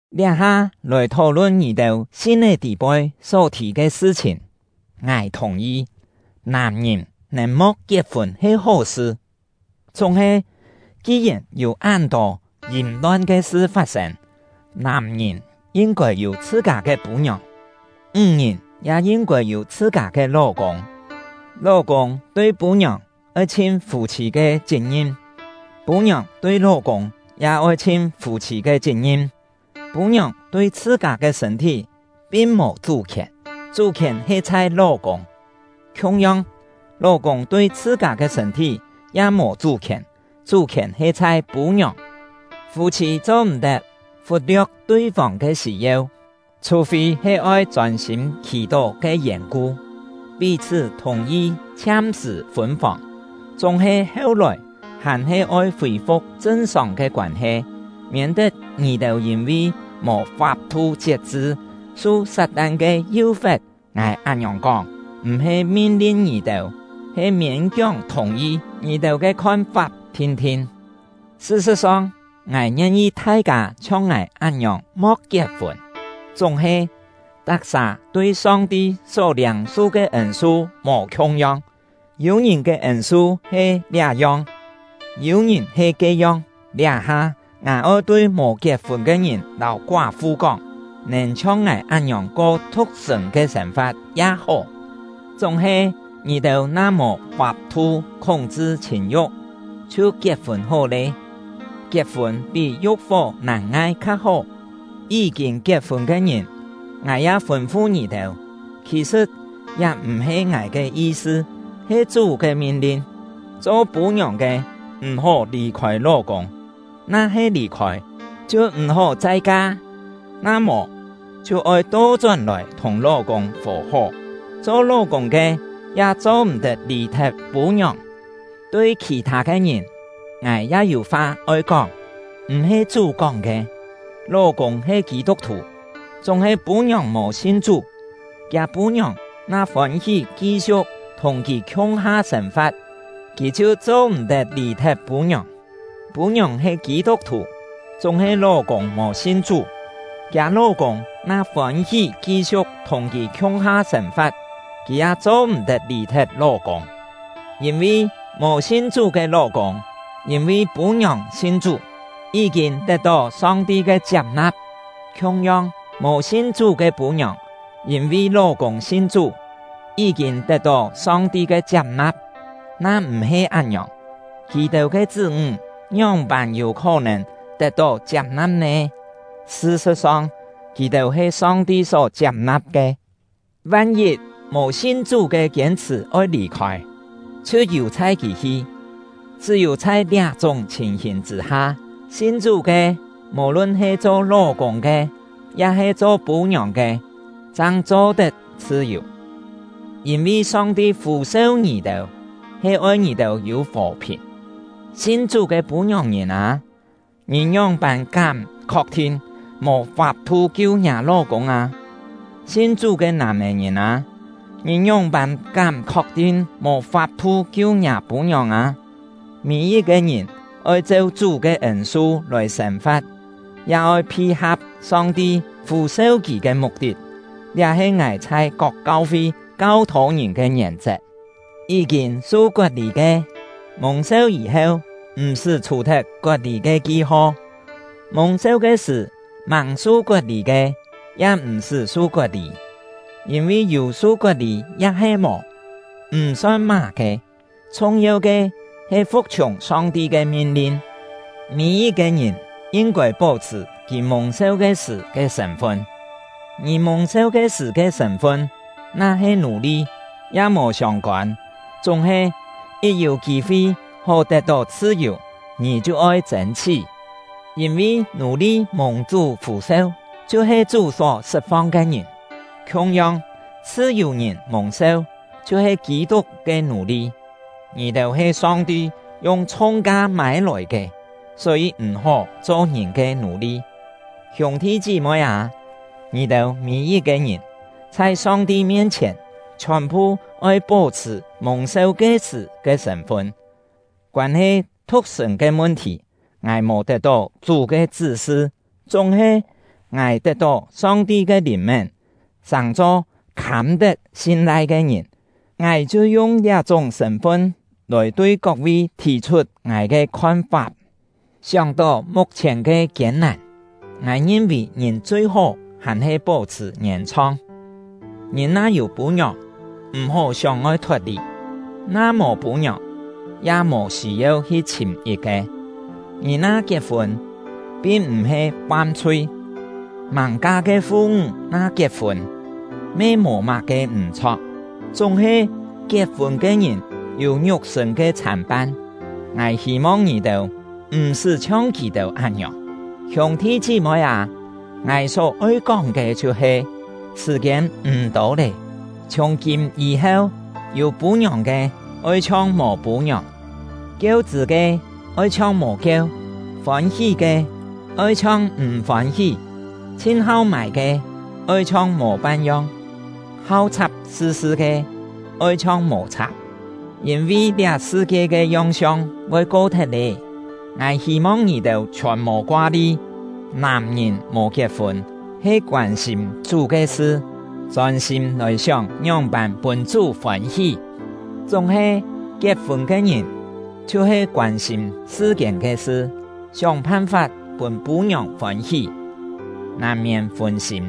Liá-ha lòi thó-lun ngì-têu sin-é tî-poi só thì ke sṳ-chhìn. Ngài thùng-yi, nàm-ngìn nèn mo̍k kiet-fûn he hó-sṳ. Chúng-he, ki-yèn yû án-tô yìm-lon ke sṳ fat-sên, nàm-ngìn yin-kôi yû chhṳ-kâ ke pû-ngiòng; ńg-ngìn ya yin-kôi yû chhṳ-kâ ke ló-kûng. Ló-kûng tui pû-ngiòng oi chhin fû-chhî ke chit-ngim; pû-ngiòng tui ló-kûng ya oi chhin fû-chhî ke chit-ngim. Pû-ngiòng tui chhṳ-kâ ke sṳ̂n-thí pin mò chú-khièn, chú-khièn he chhai ló-kûng; khiung-yong, ló-kûng tui chhṳ-kâ ke sṳ̂n-thí ya mò chú-khièn, chú-khièn he chhai pû-ngiòng. Fû-chhî cho-m̀-tet fut-lio̍k tui-fông ke sî-yeu, chhù-fî he oi chôn-sîm khì-tó ke yèn-ku, pí-chhṳ́ thùng-yi chhiam-sṳ̀ fûn-fòng; chúng-he heu-lòi hàn-he oi fî-fu̍k chṳn-sòng ke koân-he, miên-tet ngì-têu yîn-vi mò fap-thu chiet-chṳ, su Sat-tan ke yú-fe̍t. Ngài án-ngiòng kóng, m̀-he min-lin ngì-têu, he miên-kióng thùng-yi ngì-têu ke khon-fap thin-thin. Sṳ-sṳ̍t-song, ngài ngien-yi thai-kâ chhiong ngài án-ngiòng mo̍k kiet-fûn; chúng-he, tak-sà tui Song-ti só liâng-su ke ên-su mò khiung-yong, yû-ngìn ke ên-su he liá-yong, yû-ngìn he ke-yong. Liá-ha, ngài oi tui mò kiet-fûn ke ngìn lâu koá-fu kóng: Nèn chhiong ngài án-ngiòng ko thu̍k-sṳ̂n ke sên-fa̍t ya hó. Chúng-he, ngì-têu na mò fap-thu khúng-chṳ chhìn-yu̍k, chhiu kiet-fûn hó lé. Kiet-fûn pí yu̍k-fó nàn-ngai kha hó. Yí-kîn kiet-fûn ke ngìn, ngài ya oi fûn-fu ngì-têu; khì-sṳ̍t liá m̀-he ngài ke yi-sṳ, he Chú ke min-lin: Cho pû-ngiòng ke m̀-hó lì-khôi ló-kûng; na-he lì-khôi, chhiu m̀-hó chai ka; na mò, chhiu oi to-chón-lòi thùng ló-kûng fò-hó. Cho ló-kûng ke ya cho-m̀-tet lì-thet pû-ngiòng. Tui khì-thâ ke ngìn, ngài ya yû fa oi kóng (m̀-he Chú kóng ke): Ló-kûng he Kî-tuk-thù, chúng-he pû-ngiòng mò sin Chú, kiâ pû-ngiòng na fôn-hí ki-siu̍k thùng kì khiung-ha sên-fa̍t, kì chhiu cho-m̀-tet lì-thet pû-ngiòng. Pû-ngiòng he Kî-tuk-thù, chúng-he ló-kûng mò sin Chú, kiâ ló-kûng na fôn-hí ki-siu̍k thùng kì khiung-ha sên-fa̍t, kì ya cho-m̀-tet lì-thet ló-kûng. Yîn-vi, mò sin Chú ke ló-kûng yîn-vi pû-ngiòng sin Chú, yí-kîn tet-tó Song-ti ke chiap-na̍p; khiung-yong, mò sin Chú ke pû-ngiòng yîn-vi ló-kûng sin Chú, yí-kîn tet-tó Song-ti ke chiap-na̍p. Na m̀-he án-ngiòng, kì-têu ke chṳ́-ńg ngióng-pân yû khó-nèn tet-tó chiap-na̍p nè? Sṳ-sṳ̍t-song, kì-têu he Song-ti só chiap-na̍p ke. Van-yit, mò sin Chú ke kiên-chhṳ̀ oi lì-khôi, chhiu yù-chhai kì hi. Chṳ́-yû chhai liá-chúng chhìn-hìn chṳ̂-ha, sin Chú ke, mò-lun he cho ló-kûng ke ya-he cho pû-ngiòng ke, chang cho-tet chhṳ-yù. Yîn-vi Song-ti fû-seu ngì-têu, he oi ngì-têu yû fò-phìn. Sin Chú ke pû-ngiòng-ngìn â, ngì ngióng-pân kám khok-thin mò fap-thu kiu ngiâ ló-kûng â? Sin Chú ke nàm-é-ngìn â, ngì ngióng-pân kám khok-thin mò fap-thu kiu ngiâ pû-ngiòng â? Mî-yit-ke ngìn oi cheu Chú ke ên-su lòi sên-fa̍t, ya oi phi-ha̍p Song-ti fû-seu kì ke muk-tit. Liá he ngài chhai kok kau-fi kau-thô ngìn ke ngièn-chet. Yí-kîn su kot-lî ke, mùng-seu yî-heu m̀-sṳ́ chhù-thet kot-lî ke ki-ho; mùng-seu ke sṳ̀ màng su kot-lî ke, ya m̀-sṳ́ su kot-lî. Yîn-vi yû su kot-lî ya-he mò, m̀ son má-ke; chhung-yeu ke he fu̍k-chhiùng Song-ti ke min-lin. Mî-yit-ke ngìn yin-kôi pó-chhṳ̀ kì mùng-seu ke sṳ̀ ke sṳ̂n-fun. Ngì mùng-seu ke sṳ̀ ke sṳ̂n-fun na-he nù-li, ya mò siông-kôn; chúng-he, yit yû kî-fi hó tet-tó chhṳ-yù, ngì chhiu oi chên-chhí. Yîn-vi nù-li mùng Chú fû-seu chhiu-he Chú só sṳt-fong ke ngìn; khiung-yong, chhṳ-yù-ngìn mùng-seu chhiu-he Kî-tuk ke nù-li. Ngì-têu he Song-ti yung chhung-ka mâi-lòi ke, só-yî m̀-hó cho ngìn ke nù-li. Hiûng-thi chí-moi â, ngì-têu mî-yit-ke ngìn, chhai Song-ti mien-chhièn, chhiòn-phu oi pó-chhṳ̀ mùng-seu ke-sṳ̀ ke sṳ̂n-fun. Koân-he thu̍k-sṳ̂n ke mun-thì, ngài mò tet-tó Chú ke chṳ́-sṳ. Chúng-he, ngài tet-tó Song-ti ke lìn-mén, sàng-cho khâm-tet sin-lai ke ngìn; ngài chhiu yung liá-chúng sṳ̂n-fun lòi tui kok-vi thì-chhut ngài ke khon-fap. Sióng-tó muk-chhièn ke kiên-nàn, ngài ngin-vì ngìn chui-hó hàn-he pó-chhṳ̀ ngièn-chhong. Ngìn na yû pû-ngiòng, m̀-hó sióng-oi thot-lì; na mò pû-ngiòng, ya mò sî-yeu hi chhìm yit-ke. Ngì na kiet-fûn, pin m̀-he fam-chhui; màng-ka ke fu-ńg na kiet-fûn, me mò má-ke m̀-chho̍k. Chúng-he, kiet-fûn ke ngìn yû ngiuk-sṳ̂n ke chhàn-pan; ngài hî-mong ngì-têu m̀-sṳ́ chhiong kì-têu án-ngiòng. Hiûng-thi chí-moi â, ngài só-oi kóng ke chhiu-he: Sṳ̀-kiên m̀ tô lé. Chhiùng-kîm yî-heu, yû pû-ngiòng ke, oi chhiong mò pû-ngiòng; kieu-chṳ̂ ke, oi chhiong mò kieu; fôn-hí ke, oi chhiong m̀ fôn-hí; chhin-hau mâi ke, oi chhiong mò pan-yong; hau chhap sṳ sṳ ke, oi chhiong mò chhap. Yîn-vi liá sṳ-kie ke yong-siong voi ko-thet lé. Ngài hî-mong ngì-têu chhiòn mò koa-li. Nàm-ngìn mò kiet-fûn he koân-sîm Chú ke sṳ, chôn-sîm lòi sióng ngióng-pân pûn Chú fôn-hí; chúng-he, kiet-fûn ke ngìn chhiu-he koân-sîm sṳ-kiên ke sṳ, sióng phan-fap pûn pû-ngiòng fôn-hí, nàn-miên fûn-sîm.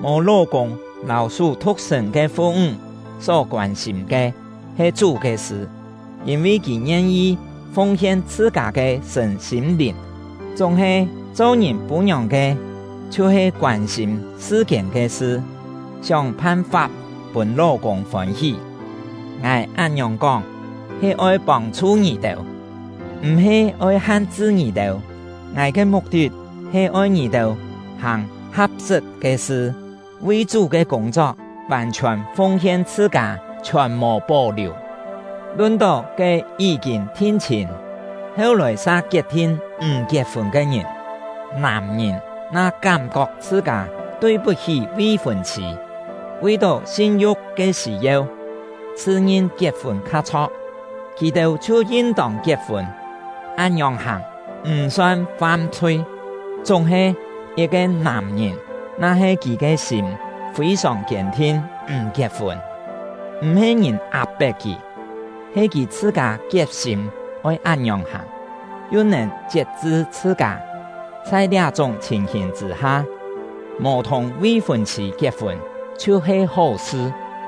Mò ló-kûng lâu sú thu̍k-sṳ̂n ke fu-ńg só koân-sîm ke he Chú ke sṳ; yîn-vi kì ngien-yi fung-hien chhṳ-kâ ke sṳ̂n-sîm-lìn; chúng-he, cho ngìn pû-ngiòng ke chhiu-he koân-sîm sṳ-kiên ke sṳ, sióng phan-fap pûn ló-kûng fôn-hí. Ngài án-ngiòng kóng, he oi pông-chhu ngì-têu, m̀-he oi han-chṳ ngì-têu. Ngài ke muk-tit he oi ngì-têu hàng ha̍p-sṳt ke sṳ, vi Chú ke kûng-chok vàn-chhiòn fung-hien chhṳ-kâ, chhiòn mò pó-liù. Lun-tó ke yí-kîn thin-chhîn, heu-lòi sa kiet-thin m̀ kiet-fûn ke ngìn, nàm-ngìn na kám-kok chhṳ-kâ tui-put-hí vi-fûn-chhî, vi-tó sin-yu̍k ke sî-yeu, chhṳ-ngin kiet-fûn kha chho̍k, kì-têu chhiu yin-tông kiet-fûn; án-ngiòng hàng, m̀ son fam-chhui. Chúng-he, yit-ke nàm-ngìn na-he kì ke sîm fî-sòng kiên-thin m̀ kiet-fûn, (m̀-he ngìn ap-pet kì, he kì chhṳ-kâ kiet-sîm oi án-ngiòng hàng), yu nèn chiet-chṳ chhṳ-kâ, chhai liá-chúng chhìn-hìn chṳ̂-ha, mò thùng vi-fûn-chhî kiet-fûn chhiu-he hó-sṳ.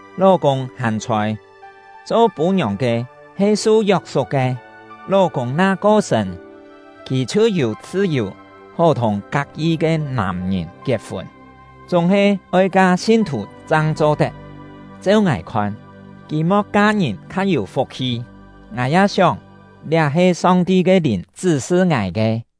Ló-kûng hàn chhôi, cho pû-ngiòng ke he su yok-suk ke; ló-kûng na ko-sṳ̂n, kì chhiu yû chhṳ-yù hó thùng kak-yi ke nàm-ngìn kiet-fûn, chúng-he oi ka sin-thù chang cho-tet. Cheu ngài khon, kì mo̍k ka-ngìn kha yû fuk-hi; ngài ya sióng, liá he Song-ti ke Lìn chṳ́-sṳ ngài ke.